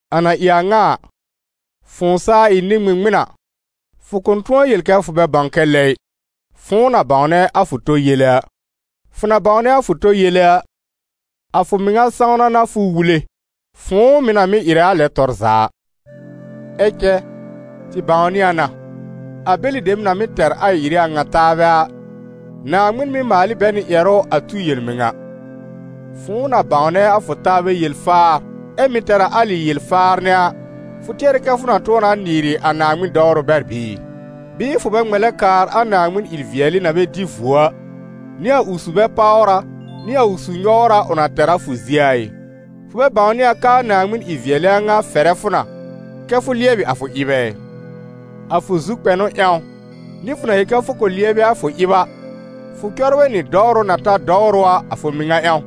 A na ɩ a ŋa a, fʋ̃ʋ saa ɩ nɩ-ŋmɩŋmɩn a, fʋ kʋ̃ tʋ̃ɔ yel kɛ fʋ bɛ bãw kɛ lɛ ɩ, fʋ̃ʋ na bãwnɛ a fʋ tɔ yele a. Fʋ na bãwnɛ a fʋ tɔ yele a, a fʋ mɩŋa sãwna n'a fʋ wule, fʋ̃ʋ mɩ̀ na mɩ́ ɩrɛ a lɛ tɔr za a. Ɛ cɛ, tɩ bãwnɩ a na, a bɛlɩ dem na mɩ́ tɛr a ɩ-ɩrɩ a ŋa taabɛ a, Naaŋmɩn mɩ́ maal ɩ bɛ nɩ a ƴɛrʋ a tu yel-mɩŋa. Fʋ̃ʋ na bãwnɛ a fʋ taabɛ yel-faar ɛ́ mɩ̀ tɛr a alɩ yel-faar nɛ a, fʋ tɩɛrɛ kɛ fʋ na tʋ̃ɔ na nɩɩrɩ a Naaŋmɩn dɔwrʋ bɛr bɩɩ? Bɩɩ fʋ bɛ ŋmɛlɛ kaar a Naaŋmɩn ɩ-vɩɛlɩ na bɛ dɩ vuo a, nɩ a ʋ su-bɛ-páwra nɩ a ʋ su-nyɔwra ʋ na tɛr a fʋ zie a ɩ? Fʋ bɛ bãwnɩ a k'aa Naaŋmɩn ɩ-vɩɛlɩ a ŋa fɛrɛ fʋ na kɛ fʋ lɩɛbɩ a fʋ ɩb ɛ? A fʋ zu-kpɛnʋ ƴãw, nɩ fʋ na yel kɛ fʋ kʋ̃ lɩɛbɩ a fʋ ɩb a, fʋ cɔbrɛ nɩ dɔwrʋ na ta dɔwrʋ a a fʋ mɩŋa ƴãw,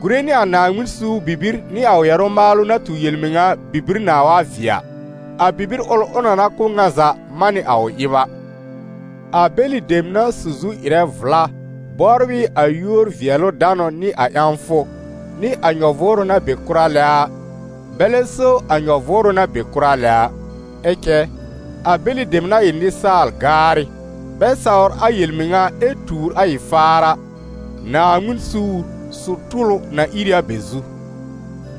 gùre nɩ a Naaŋmɩn suur bibir nɩ a ʋ ƴɛrʋ maalʋ na tu yel-mɩŋa a bibir nãa wa vɩɛ a, a bibir ʋl ʋ na na kʋ̀ ŋa za man nɩ a ʋ ɩb a. A bɛlɩ dem na su zu ɩrɛ vla bɔbr ɩ a yúor-vɩɛlʋ-danʋ nɩ a ƴãwfʋ, nɩ a nyɔ-vʋʋrʋ na be kʋra lɛ a, bɛlɛ so a nyɔ-vʋʋrʋ na be kʋra lɛ a. Ɛ cɛ, a bɛlɩ dem na ɩ a nɩsaal-gaarɩ, bɛ sawr a yel-mɩŋa ɛ tuur a ɩ-faar a, Naaŋmɩn suur, su-tʋlʋ, na ìr ɩ a bɛ zu.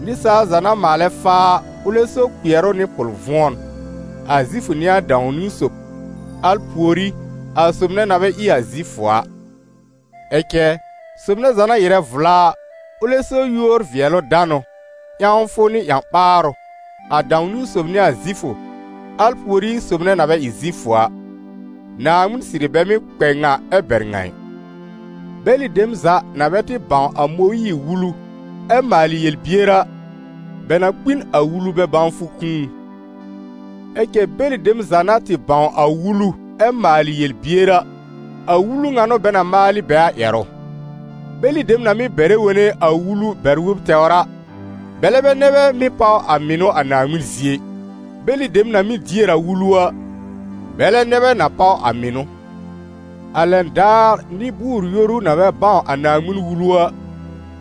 Nɩsaal za na maalɛ faa a, ʋlɛ so kpɩɛrʋ nɩ pʋl-vʋ̃ɔn, a Zifʋ n'ɩ a dãw-niwn sob, al pùorí, a sob nɛ na bɛ ɩ Zifʋ a. Ɛ cɛ, sob nɛ za na ɩrɛ vla a, ʋlɛ so yúor-vɩɛlʋ-danʋ, ƴãwfʋ nɩ ƴã-ɓaarʋ, a dãw-niwn sob n'ɩ a Zifʋ, al pùorí sob nɛ na bɛ ɩ Zifʋ a. Naaŋmɩn sɩrɩ bɛ mɩ́ kpɛ ŋa ɛ bɛr ŋa ɩ. Bɛlɩ dem za na bɛ tɩ bãw a Mõyiir-Wulu ɛ maalɩ yel-bier a, bɛ na kpi n a Wulu bɛ-bãwfʋ kũu. Ɛ cɛ bɛlɩ dem za na tɩ bãw a Wulu ɛ maalɩ yel-bier a, a Wulu ŋa n'ʋ bɛ na maal ɩ bɛ a ƴɛrʋ. Bɛlɩ dem na mɩ́ bɛrɛ wone a Wulu bɛr-wob tɛwr a, bɛlɛ bɛ nɛ bɛ mɩ́ páw a mɩnʋ a Naaŋmɩn zie ɩ, bɛlɩ dem na mɩ́ dier a Wulu a, bɛlɛ nɛ bɛ na páw a mɩnʋ. A lɛn daar nɩ-bʋʋr-yoru, na bɛ bãw a Naaŋmɩn-Wulu a,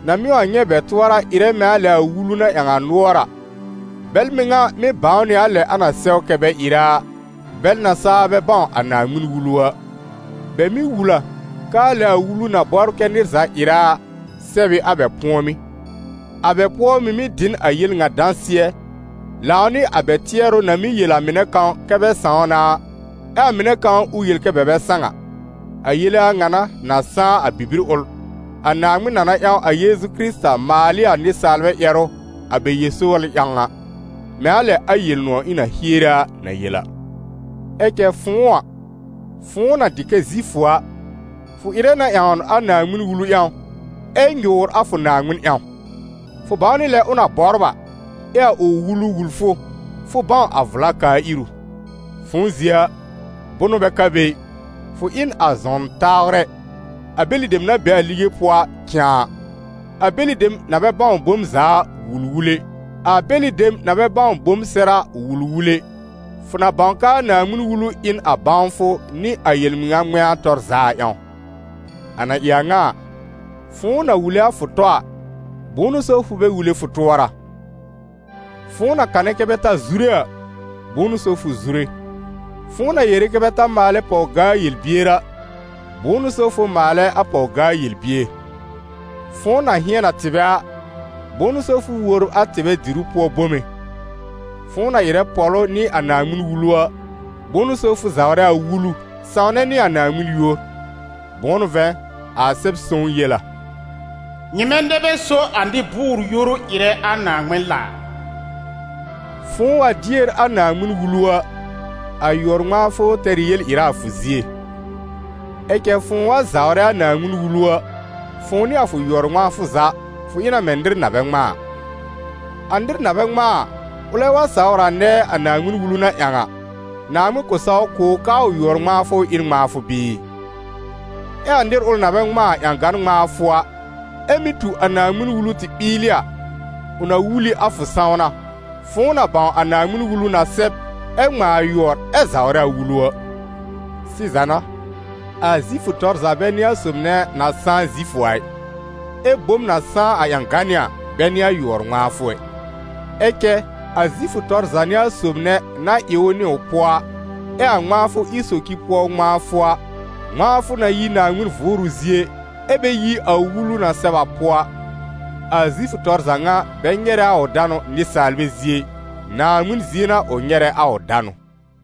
na mɩ́ wa nyɛ̃ bɛ tʋɔra ɩrɛ mɛ̃ a lɛ a Wulu na ƴãw a nʋɔr a, bɛl mɩŋa mɩ́ bãw nɩ a lɛ a na sɛw kɛ bɛ ɩrɛ a, bɛl na saa bɛ bãw a Naaŋmɩn-Wulu a. Bɛ mɩ́ wul a, k'aa lɛ a Wulu na bɔbr kɛ nɩr za ɩrɛ a, sɛb ɩ a bɛ pʋ̃ɔmɩ́. A bɛ pʋɔ mɩ́ mɩ̀ dɩ n a yel ŋa dãsɩɛ, lãw nɩ a bɛ tɩɛrʋ na mɩ́ yel a mɩnɛ kãw kɛ́ bɛ sãw na a, ɛ a mɩnɛ kãw ʋ yel kɛ bɛ bɛ sãw a. A yele a ŋa n'a na sãá a bibir ʋl, a Naaŋmɩn na na ƴãw a Yeezu Kɩrɩta maal ɩ a nɩsaalbɛ ƴɛrʋ a bɛ yel-sɔwlɩ ƴãw a, mɛ̃ a lɛ a Yel-nʋ̃ɔ̀ ɩ̃ na hiere a na yel a. Ɛ cɛ fʋ̃ʋ a, fʋ̃ʋ na dɩ kɛ Zifʋ a, fʋ ɩrɛ na ƴãwn a Naaŋmɩn-Wulu ƴãw ɛ nyʋʋr a fʋ Naaŋmɩn ƴãw; fʋ bãw nɩ a lɛ ʋ na bɔbr a, ɛ a ʋ Wulu wul fʋ, fʋ bãw a vla kaa-iru; fʋ̃ʋ zie a, bʋnʋ bɛ ka be ɩ, fʋ ɩ n a zɔn tãwrɛ, a bɛlɩ dem na be a lige pʋɔ a cãà, a bɛlɩ dem na bɛ bãw bom za a wul-wule, a bɛlɩ dem na bɛ bãw bom sɛr a wul-wule, fʋ na bãw k'aa Naaŋmɩn-Wulu ɩ n a bãwfʋ nɩ a yel-mɩŋa ŋmɛ̃a tɔr za a ƴãw. A na ɩ a ŋa a, fʋ̃ʋ na wule a fʋ tɔ a, bʋ̃ʋ n'ʋ so fʋ bɛ wule fʋ tʋɔra? Fʋ̃ʋ na kanɛ kɛ́ bɛ ta zure a, bʋ̃ʋ n'ʋ so fʋ zure? Fʋ̃ʋ na yere kɛ́ bɛ ta maalɛ pɔw-gaa-yel-bier a, bʋ̃ʋ n'ʋ so fʋ maalɛ a pɔw-gaa-yel-bier? Fʋ̃ʋ na hɩ̃ɛn a tɩbɛ a, bʋ̃ʋ n'ʋ so fʋ wòbr a tɩbɛ diru pʋɔ bome? Fʋ̃ʋ na ɩrɛ pɔ̀lʋ nɩ a Naaŋmɩn-Wulu a, bʋ̃ʋ n'ʋ so fʋ zawrɛ a Wulu, sãwnɛ nɩ a Naaŋmɩn yúor? Bʋ̃ʋ n'ʋ vɛ̃, a Sɛb-sõw yel a: «Nyɩmɛ nɛ bɛ so a nɩ-bʋʋr-yoru ɩrɛ a Naaŋmɩn laar.» Fʋ̃ʋ wa dier a Naaŋmɩn-Wulu a, a yʋɔr-ŋmãafʋ tɛr ɩ yel-ɩra a fʋ zie; ɛ cɛ fʋ̃ʋ wa zawrɛ a Naaŋmɩn-Wulu a, fʋ̃ʋ nɩ a fʋ yʋɔr-ŋmãafʋ za, fʋ ɩ na mɛ̃ nɩr na bɛ ŋmãa a. A nɩr na bɛ ŋmãa a, ʋlɛ wa sawr a nɛɛ a Naaŋmɩn-Wulu na ƴãw a, Naaŋmɩn kʋ̃ saw kʋ̀ ʋ k'aa yʋɔr-bɛ-ŋmãafʋ ɩ n ŋmãafʋ bɩɩ? Ɛ a nɩr ʋl na bɛ ŋmãa a ƴãgan ŋmãafʋ a, ɛ́ mɩ́ tu a Naaŋmɩn-Wulu tɩ ɓɩɩlɩ a, ʋ na wul ɩ a fʋ sãwna, fʋ̃ʋ na bãw a Naaŋmɩn-Wulu na sɛb, ɛ ŋmãa a yʋɔr, ɛ zawrɛ a Wulu a. Sɩza n'a, a Zifʋ tɔr za bɛ n'ɩ a sob nɛ na sãá Zifʋ a ɩ, ɛ́ bom na sãá a ƴãganɩ́ a, bɛ n'ɩ a yʋɔr-ŋmãafʋ ɛ. Ɛ cɛ a Zifʋ tɔr za n'ɩ a sob nɛ na ɩ ʋ nɩ ʋ pʋɔ a, ɛ a ŋmãafʋ ɩ socir pʋɔ ŋmãafʋ a, ŋmãafʋ na yi Naaŋmɩn Vʋʋrʋ zie ɛ bɛ yi Wulu na sɛb a pʋɔ a. A Zifʋ tɔr za ŋa bɛ nyɛrɛ a ʋ danʋ nɩsaalbɛ zie ɩ, Naaŋmɩn zie n'a ʋ nyɛrɛ a ʋ danʋ.